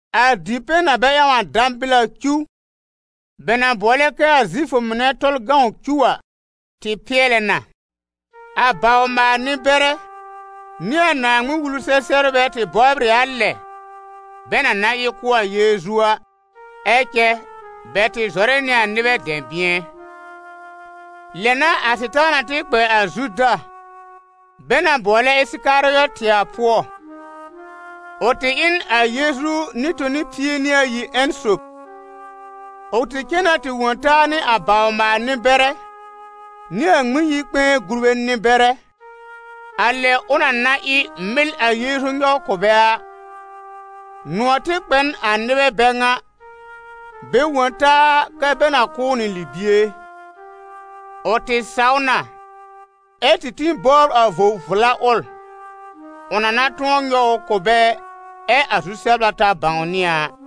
A dipɛ̃ na bɛ ƴãw dãbɩl a cuw, bɛ na bʋɔlɛ kɛ a Zifʋ mɩnɛ Tɔlʋ cuw a, tɩ pɩɛlɛ na. A bawr-maal-nɩ-bɛrɛ nɩ a Naaŋmɩn-Wulu-sɛ-sɛbrbɛ tɩ bɔbr ɩ a lɛ bɛ na na ɩ kʋ́ a Yeezu a. Ɛ cɛ bɛ tɩ zɔrɛ nɩ a nɩbɛ dɛ̃bɩ̃ɛ. Lɛ n'a a Sɩtaana tɩ kpɛ a Zuda bɛ na bʋɔlɛ Ɩsɩkarɩɔtɩ a pʋɔ. Ʋ tɩ ɩ n a Yeezu nɩ-toni pie nɩ ayi ƴẽn sob. Ʋ tɩ cen na tɩ wõ taa nɩ a bawr-maal-nɩ-bɛrɛ nɩ a Ŋmɩn-yi-kpɛ̃ɛ gurbɛ nɩ-bɛrɛ, a lɛ ʋ na na ɩ mɩl a Yeezu nyɔw kʋ̀ bɛ a. Nʋ̃ɔ̀ tɩ kpɛ n a nɩbɛ bɛ ŋa, bɛ wõ taa kɛ bɛ na kʋ̀ ʋ nɩ libie. Ʋ tɩ saw na ɛ tĩ bɔbr a vo-vla ʋl, ʋ na na tʋ̃ɔ nyɔw ʋ kʋ̀ bɛ ɛ a zu-sɛbla ta bãwnɩ a a.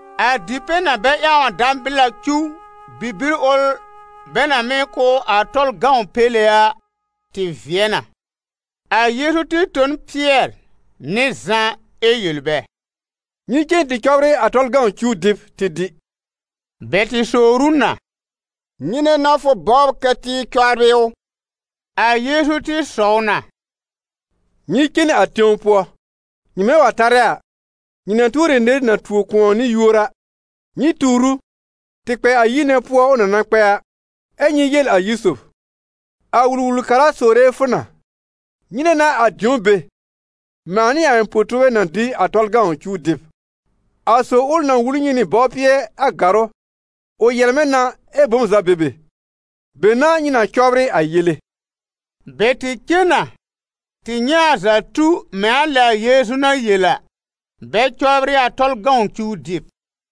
A dipɛ̃ na bɛ ƴãw dãbɩl a cuw bibir ʋl, bɛ na mɩ́ kʋ́ a Tɔlʋ péle a, tɩ vɩɛ na. A Yeezu tɩ tõ n Pɩɛr nɩ Zã ɛ yel bɛ: «Nyɩ cen tɩ cɔbrɩ a Tɔlʋ cuw dɩb tɩ dɩ.» Bɛ tɩ sowr ʋ na: «Nyɩnɛ n'a fʋ bɔbr kɛ tɩ cɔbrɩ ʋ?» A Yeezu tɩ sɔw na: «Nyɩ cen a tẽw pʋɔ, nyɩmɛ wa tarɛ a, nyɩ na tuor ɩ nɩr na tuo kʋ̃ɔ nɩ yuor a, nyɩ tuur ʋ tɩ kpɛ a yir nɛ pʋɔ ʋ na na kpɛ a; ɛ́ nyɩ yel a yir sob: ‹A Wul-wul-kara sowre fʋ na: Nyɩnɛ n'a a dĩo be, mãa nɩ a ɩ̃ po-tuurbɛ na dɩ a Tɔlʋ cuw dɩb?› A sob ʋl na wul nyɩ nɩ bɔwpɩɛ a gàrʋ́, ʋ yɛlmɛ̃ na ɛ bom za be be; be n'a nyɩ na cɔbrɩ a yele.» Bɛ tɩ cen na tɩ nyɛ̃ a za tu mɛ̃ a lɛ a Yeezu na yel a, bɛ cɔbrɩ a Tɔlʋ cuw dɩb.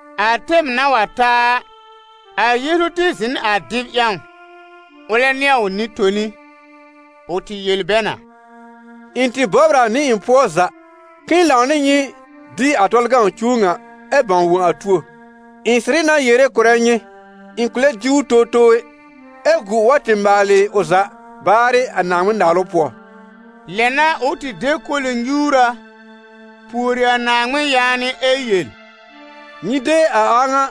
A tɛm na wa ta a, a Yeezu tɩ zɩ̃ n a dɩb ƴãw ʋlɛ nɩ a ʋ nɩ-toni. Ʋ tɩ yel bɛ na: «Ɩ̃ tɩ bɔbr a nɩ ɩ̃ pʋɔ za, k'ɩ̃ɩ lãw nɩ nyɩ dɩ a Tɔlʋ cuw ŋa ɛ bãw wõ a tuo. Ɩ̃ sɩrɩ na yere kʋ̀rɛ nyɩ, ɩ̃ kʋ̃ lɛ dɩ ʋ towtow ɛ, ɛ gu ʋ wa tɩ maalɩ ʋ za baarɩ a Naaŋmɩn-Naalʋ pʋɔ.» Lɛ n'a ʋ tɩ de koli-nyuura, pùori a Naaŋmɩn yaanɩ ɛ yel: «Nyɩ de a a ŋa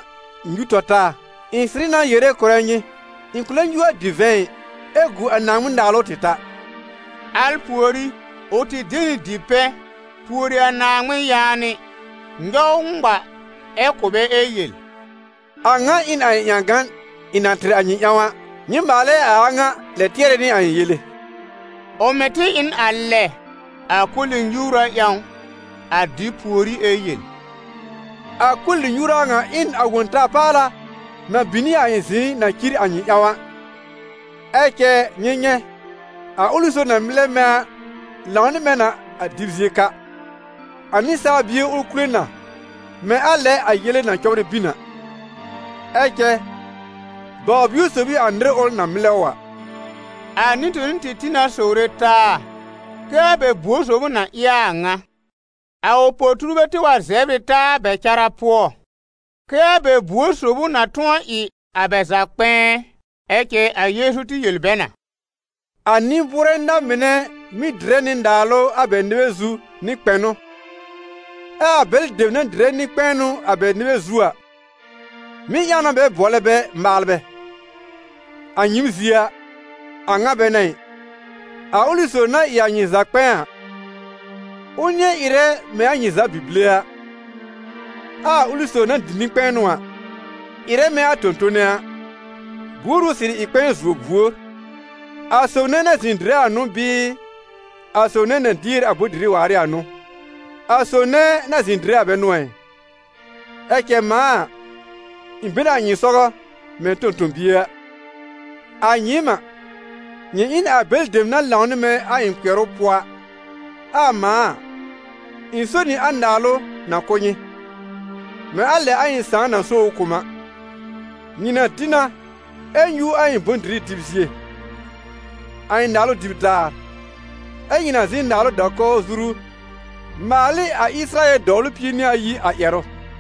nyũ tɔ taa. Ɩ̃ sɩrɩ na yere kʋ̀rɛ nyɩ, ɩ̃ kʋ̃ lɛ nyũ a divɛ̃ ɩ, ɛ gu a Naaŋmɩn-Naalʋ tɩ ta.» Al pùorí, ʋ tɩ de nɩ dipɛ̃, pùori a Naaŋmɩn yaanɩ, nyɔw ŋma, ɛ kʋ̀ bɛ ɛ yel: «A ŋa ɩ n a ɩ̃ ƴãgan ɩ̃ na tɩr a nyɩ ƴãw a. Nyɩ maalɛ a a ŋa lɛb tɩɛrɛ nɩ a ɩ̃ yele.» Ʋ mɩ̀ tɩ ɩ n a lɛ a koli-nyuura ƴãw, a dɩb pùorí, ɛ yel: «A koli-nyuura ŋa ɩ n a Wõ-ta-paala na bin nɩ a ɩ̃ zɩ̃ɩ na cir a nyɩ ƴãw a. Ɛ cɛ nyɩ nyɛ̃, a ʋlɩ sob na mɩlɛ mɛ̃ a lãw nɩ mɛ̃ na, a dɩb zie ka. A Nɩsaal Bie ʋl kule na, mɛ̃ a lɛ a yele na cɔbrɩ bin a, ɛ cɛ baw-bio sob n'ɩ a nɩr ʋl na mɩlɛ ʋ a.» A nɩ-toni tɩ tĩ na sowre taa kɛ a bɛ buor sob ʋ na ɩ a a ŋa. A ʋ po-tuurbɛ tɩ wa zɛbr ɩ taa a bɛ cara pʋɔ, kɛ́ a bɛ buor sob ʋ na tʋ̃ɔ ɩ a bɛ za kpɛ̃ɛ. Ɛ cɛ a Yeezu tɩ yel bɛ na: «A nɩ-bʋʋrɛ na-mɩnɛ mɩ́ dɩrɛ nɩ naalʋ a bɛ nɩbɛ zu nɩ kpɛnʋ, ɛ a bɛlɩ dem na dɩrɛ nɩ-kpɛ̃ɛnʋ a bɛ nɩbɛ zu a, mɩ́ ƴãw na bɛ bʋɔlɛ bɛ maalbɛ. A nyɩɩm zie a, a ŋa bɛ n'a ɩ. A ʋlɩ sob na ɩ a nyɩ za kpɛ̃ɛ a, ʋ nɩ̃ɛ ɩrɛ mɛ̃ a nyɩ za bi-bile a, ɛ a ʋlɩ sob na dɩ nɩ-kpɛ̃ɛnʋ a, ɩrɛ mɛ̃ a tõ-tone a. Buor ʋ sɩrɩ ɩ kpɛ̃ɛ zuo buor: a sob nɛ na zɩ̃ dɩrɛ a n'ʋ bɩɩ a sob nɛ na dier a bʋ̃-dɩrɩ waar ɩ a n'ʋ? A sob nɛ na zɩ̃ dɩrɛ bɛ n'ʋ ɛ? Ɛ cɛ mãa a, ɩ̃ be n a nyɩ sɔgɔ mɛ̃ tõ-tõ-bie a. A nyɩɩm a, nyɩ ɩ n a bɛlɩ dem na lãw nɩ mɛ̃ a ɩ̃ kpɩɛrʋ pʋɔ a. Ɛ a mãa a, ɩ̃ so nɩ a naalʋ na kʋ̀ nyɩ, mɛ̃ a lɛ a ɩ̃ Sãà na so ʋ kʋ̀ m a: nyɩ na dɩ na ɛ nyũ a ɩ̃ bʋ̃-dɩrɩ dɩb zie, a ɩ̃ naalʋ dɩb daar, ɛ́ nyɩ na zɩ̃ n naalʋ da-kɔwr zuru maal ɩ a Ɩsɩrayɛl dɔwlʋ pie nɩ ayi a ƴɛrʋ.»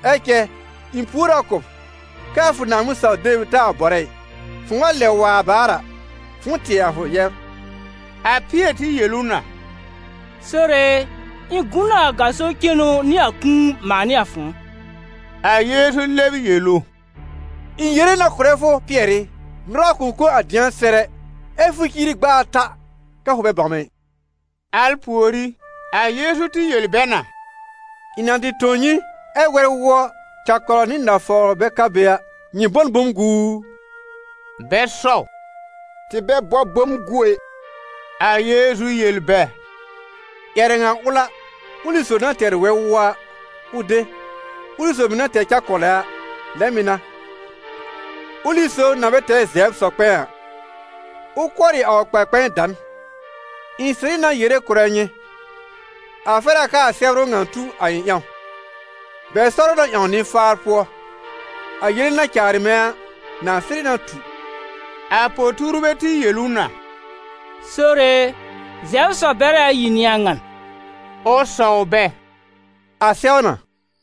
Ɛ cɛ ɩ̃ pùor a kʋ̀ b, kɛ a fʋ Naaŋmɩn-saw-deb taa bɔrɛ ɩ. Fʋ̃ʋ wa lɛb wa baar a, fʋ̃ʋ tɩɛ a fʋ yɛbr.» A Pɩɛr tɩ yel ʋ na: «Sore e, ɩ̃ gu n a gaso cenu nɩ a kũu, mãa nɩ a fʋ̃ʋ.» A Yeezu lɛb yel ʋ: «Ɩ̃ yere na kʋ̀rɛ fʋ, Pɩɛr ɩ, nʋra kʋ̃ kõ a dɩ̃a sɛr ɛ, ɛ́ fʋ ciiri gb'a ata kɛ fʋ bɛ bãw mɛ̃ ɩ.» Al pùorí, a Yeezu tɩ yel bɛ na: «Ɩ̃ na tɩ tõ nyɩ, ɛ́ wɛr-wʋɔ, cɛkɔlɔ nɩ nafawr bɛ ka be a, nyɩ bɔ n bom gu u?» Bɛ sɔw: «Tɩ bɛ bɔ bom gu ɛ.» A Yeezu yel bɛ: «Ƴɛrɛ ŋa ʋl a, ʋlɩ sob na tɛr wɛr-wʋɔ a, ʋ de, ʋlɩ sob mɩ̀ na tɛr cɛkɔlɔ a, lɛ mɩ̀ n'a; ʋlɩ sob na bɛ tɛr zɛbr sɔ-kpɛ̃ɛ a, ʋ kʋɔrɩ a ʋ kpar-kpɛ̃ɛ da n. Ɩ̃ sɩrɩ na yere kʋ̀rɛ nyɩ: a fɛr a kɛ a sɛbrʋ ŋa tu a ɩ̃ ƴãw: ‹Bɛ sɔr ʋ na ƴãw nɩ-faar pʋɔ.› A yele na caarɩ mɛ̃ a, na sɩrɩ na tu.» A po-tuurbɛ tɩ yel ʋ na: «Sore e, zɛbr sɔ-bɛrɛ ayi n'ɩ a ŋan.» Ʋ sɔw bɛ: «A sɛw na.»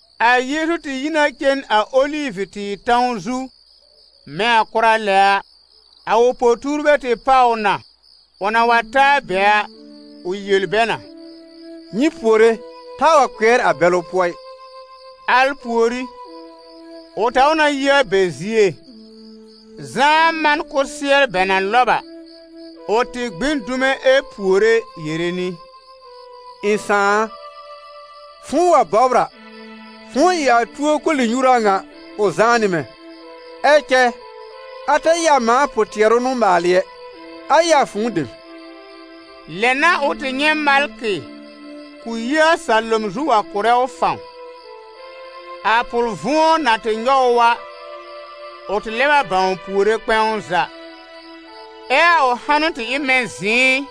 A Yeezu tɩ yi na cen a Olivʋ-tɩɩr tãw zu mɛ̃ a kʋra lɛ a. A ʋ po-tuurbɛ tɩ páw ʋ na. Ʋ na wa ta a be a, ʋ yel bɛ na: «Nyɩ puore, taa wa kpɩɛr a bɛlʋ̀ pʋɔ ɩ.» Al pùorí, ʋ taw na yi a bɛ zie, zãá man kʋsɩɛr bɛ na lɔb a, ʋ tɩ gbi n dume ɛ puore yere nɩ: «Ɩ̃ Sãà a, fʋ̃ʋ wa bɔbr a, fʋ̃ʋ ɩ a tuo koli-nyuura ŋa ʋ zãá nɩ mɛ̃, ɛ cɛ a ta ɩ a mãa pʋ-tɩɛrʋ n'ʋ maalɩ ɛ, a ɩ a fʋ̃ʋ dem.» [ Lɛ n'a ʋ tɩ nyɛ̃ malkɩ k'ʋ yi a salom zu wa kʋ̀rɛ ʋ fãw. A pʋl-vʋ̃ɔ na tɩ nyɔw ʋ a, ʋ tɩ lɛb bãw puore kpɛ̃w za, ɛ a ʋ hanʋ tɩ ɩ mɛ̃ zɩ̃ɩ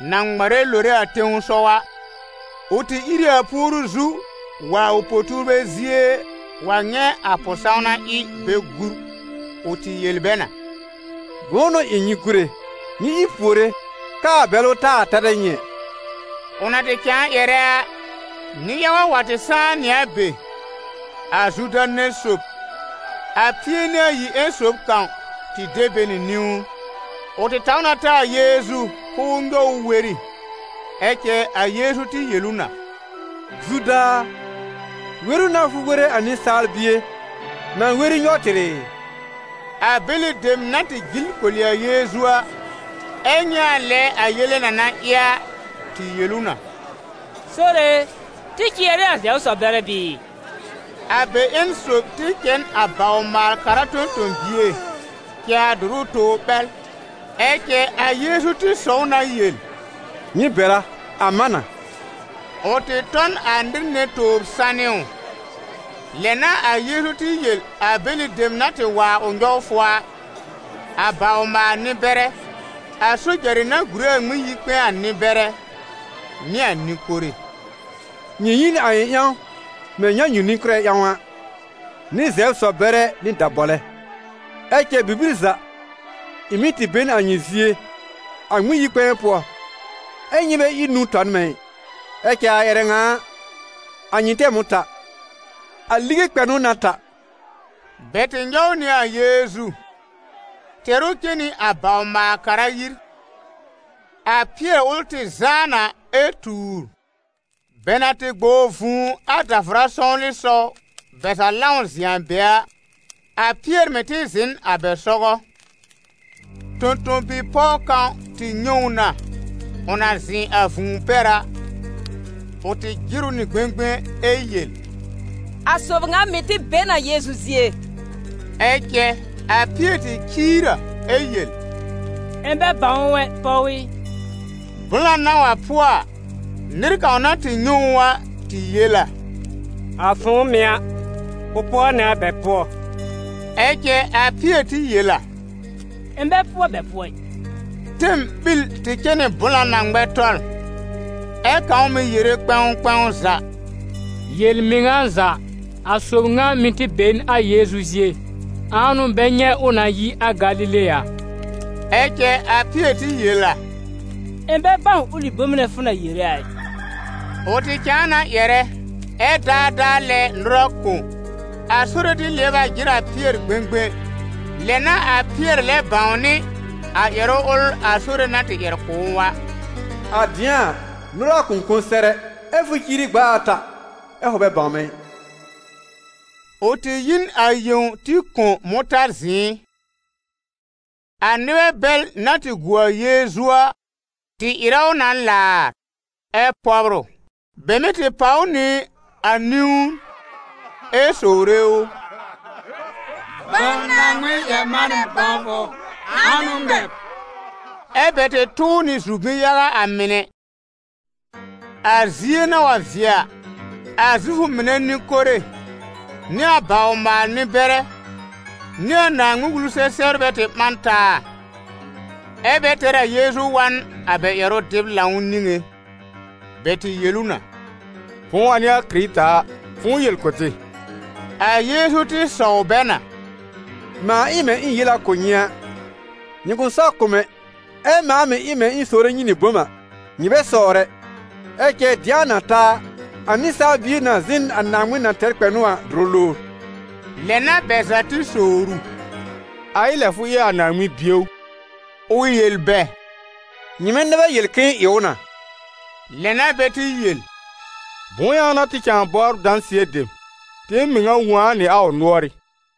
na ŋmarɛ lore a tẽsɔw a.] Ʋ tɩ ìr ɩ a puoru zu, wa a ʋ po-tuurbɛ zie wa nyɛ̃ a pʋ-sãwna ɩ bɛ gúr. Ʋ tɩ yel bɛ na: «Bʋ̃ʋ n'ʋ ɩ nyɩ gúre? Nyɩ ìr puore k'aa bɛlʋ taa tarɛ nyɩ ɛ.» Ʋ na tɩ cãa ƴɛrɛ a, nɩ-yaga wa tɩ sãá nɩ a be. A Zuda nɛ sob, a Pie-nɩ-ayi ƴẽn sob kãw, tɩ de bɛ nɩ niwn. Ʋ tɩ taw na ta a Yeezu k'ʋʋ nyɔw ʋ weri. Ɛ cɛ a Yeezu tɩ yel ʋ na: «Zuda a, weru n'a fʋ were a Nɩsaal Bie na weri nyɔw tɩr ɩ?» A bɛlɩ dem na tɩ jil koli a Yeezu a, ɛ nyɛ̃ a lɛ a yele na na ɩ a, tɩ yel ʋ na: «Sore e, tɩ cɩɛr ɩ a zɛbr sɔ-bɛrɛ bɩɩ?» A bɛ ƴẽn sob tɩ cɛ n a bawr-maal-kara tõ-tõ-bie, cɛ a dʋrʋ tobr ɓɛl. Ɛ cɛ a Yeezu tɩ sɔw na yel: «Nyɩ bɛr a, a man na.» Ʋ tɩ tɔ n a nɩr nɛ tobr sanɩ ʋ. Lɛ n'a a Yeezu tɩ yel a bɛlɩ dem na tɩ wa a ʋ nyɔwfʋ a, a bawr-maal-nɩ-bɛrɛ, a sojarɩ na gùre a Ŋmɩn-yi-kpɛ̃ɛ a nɩ-bɛrɛ, nɩ a nɩ-kore: «Nyɩ yi n a ɩ̃ ƴãw mɛ̃ nyãnyu-nɩ-kʋ́rɛ ƴãw a, nɩ zɛbr sɔ-bɛrɛ nɩ dabɔlɛ. Ɛ cɛ bibir za, ɩ̃ mɩ́ tɩ be n a nyɩ zie, a Ŋmɩn-yi-kpɛ̃ɛ pʋɔ, ɛ́ nyɩ bɛ ír nũu tɔ n mɛ̃ ɩ. Ɛ cɛ a ƴɛrɛ ŋa a, a nyɩ tɛm ʋ ta, a lige kpɛ̃nʋ n'a ta.» Bɛ tɩ nyɔw nɩ a Yeezu, tɛr ʋ cen nɩ a bawr-maal-kara yir. A Pɩɛr ʋl tɩ zãá na ɛ tuur. Bɛ na tɩ gbɔw vũu a davʋra sɔwlɩsɔw bɛ za lãw zɩ̃ a be a, a Pɩɛr mɩ̀ tɩ zɩ̃ n a bɛ sɔgɔ. Tõ-tõ-bi-pɔw kãw tɩ nyɛ̃ ʋ na, ʋ na zɩ̃ a vũu pɛr a, ʋ tɩ jɩr ʋ nɩ gbẽgbẽ ɛ yel: «A sob ŋa mɩ̀ tɩ be n a Yeezu zie.» Ɛ cɛ a Pɩɛr tɩ ciir a ɛ yel: «Ɩ̃ bɛ bãw ʋ ɛ, pɔw ɩ.» Blã na wa pʋɔ a, nɩr kãw na tɩ nyɛ̃ ʋ a, tɩ yel a: «A fʋ̃ʋ mɩ̀ a, fʋ pʋɔ nɩ a bɛ pʋɔ!» Ɛ cɛ a Pɩɛr tɩ yel a: «Ɩ̃ bɛ pʋɔ bɛ pʋɔ ɩ.» Tɛm ɓil tɩ cɛ nɩ blã na ŋmɛ tɔl, ɛ kãw mɩ̀ yere kpɛ̃w kpɛ̃w za: «Yel-mɩŋa za, a sob ŋa mɩ̀ tɩ be n a Yeezu zie, ãa n'ʋ bɛ nyɛ̃ ʋ na yi a Galile a!» Ɛ cɛ a Pɩɛr tɩ yel a: «Ɩ̃ bɛ bãw ʋlɩ bom nɛ fʋ na yere a ɩ.» Ʋ tɩ cãa na ƴɛrɛ, ɛ daadaa lɛ nʋra kõ. A Sore tɩ lɩɛb a jɩr a Pɩɛr gbẽgbẽ. Lɛ n'a a Pɩɛr lɛb bãwnɩ a ƴɛrʋ ʋl a Sore na tɩ ƴɛr kʋ̀ ʋ a: «A dɩ̃a a, nʋra kʋ̃ kõ sɛr ɛ, ɛ fʋ ciiri gb'a ata ɛ fʋ bɛ bãw mɛ̃ ɩ.» Ʋ tɩ yi n a yẽw tɩ kõ mʋ̃tã zɩ̃ɩ. A nɩbɛ bɛl na tɩ gu a Yeezu a, tɩ ɩrɛ ʋ na laar ɛ pɔbr ʋ. Bɛ mɩ́ tɩ pàw ʋ nɩ a niwn ɛ sowre ʋ: «Bãw Naaŋmɩn-ƴɛr-manɛ bãwfʋ! Ãa n'ʋ ŋmɛ b?» Ɛ́ bɛ tɩ tʋ ʋ nɩ zʋm-bi-yaga a mɩnɛ. A zie na wa vɩɛ a, a Zifʋ mɩnɛ nɩ-kore nɩ a bawr-maal-nɩ-bɛrɛ, nɩ a Naaŋmɩn-Wulu-sɛ-sɛbrbɛ tɩ ɓã n taa, ɛ́ bɛ tɛr a Yeezu wa n a bɛ ƴɛrʋ-dɩb-lãw niŋé. Bɛ tɩ yel ʋ na: «Fʋ̃ʋ wa n'ɩ a Kɩrɩta a, fʋ̃ʋ yel kʋ̀ tɩ.» A Yeezu tɩ sɔw bɛ na: «Mãa ɩ mɛ̃ ɩ̃ yel a kʋ̀ nyɩ a, nyɩ kʋ̃ saw kʋ̀ m ɛ. Ɛ mãa mɩ̀ ɩ mɛ̃ ɩ̃ sowre nyɩ nɩ bom a, nyɩ bɛ sɔwr ɛ. Ɛ cɛ dɩ̃a na ta a, a Nɩsaal Bie na zɩ̃ n a Naaŋmɩn na tɛr kpɛnʋ a dʋrʋ lowr.» Lɛ n'a bɛ za tɩ sowr ʋ: «A ɩ lɛ fʋ ɩ a Naaŋmɩn Bie ʋ?» Ʋ yel bɛ: «Nyɩmɛ nɛ bɛ yel k'ɩ̃ɩ ɩ ʋ na!» Lɛ n'a bɛ tɩ yel: «Bʋ̃ʋ ƴãw n'a tɩ cãa bɔbr dãsɩɛ dem? Tɩɩm mɩŋa wõ a nɩ a ʋ nʋ́ɔrɩ́!»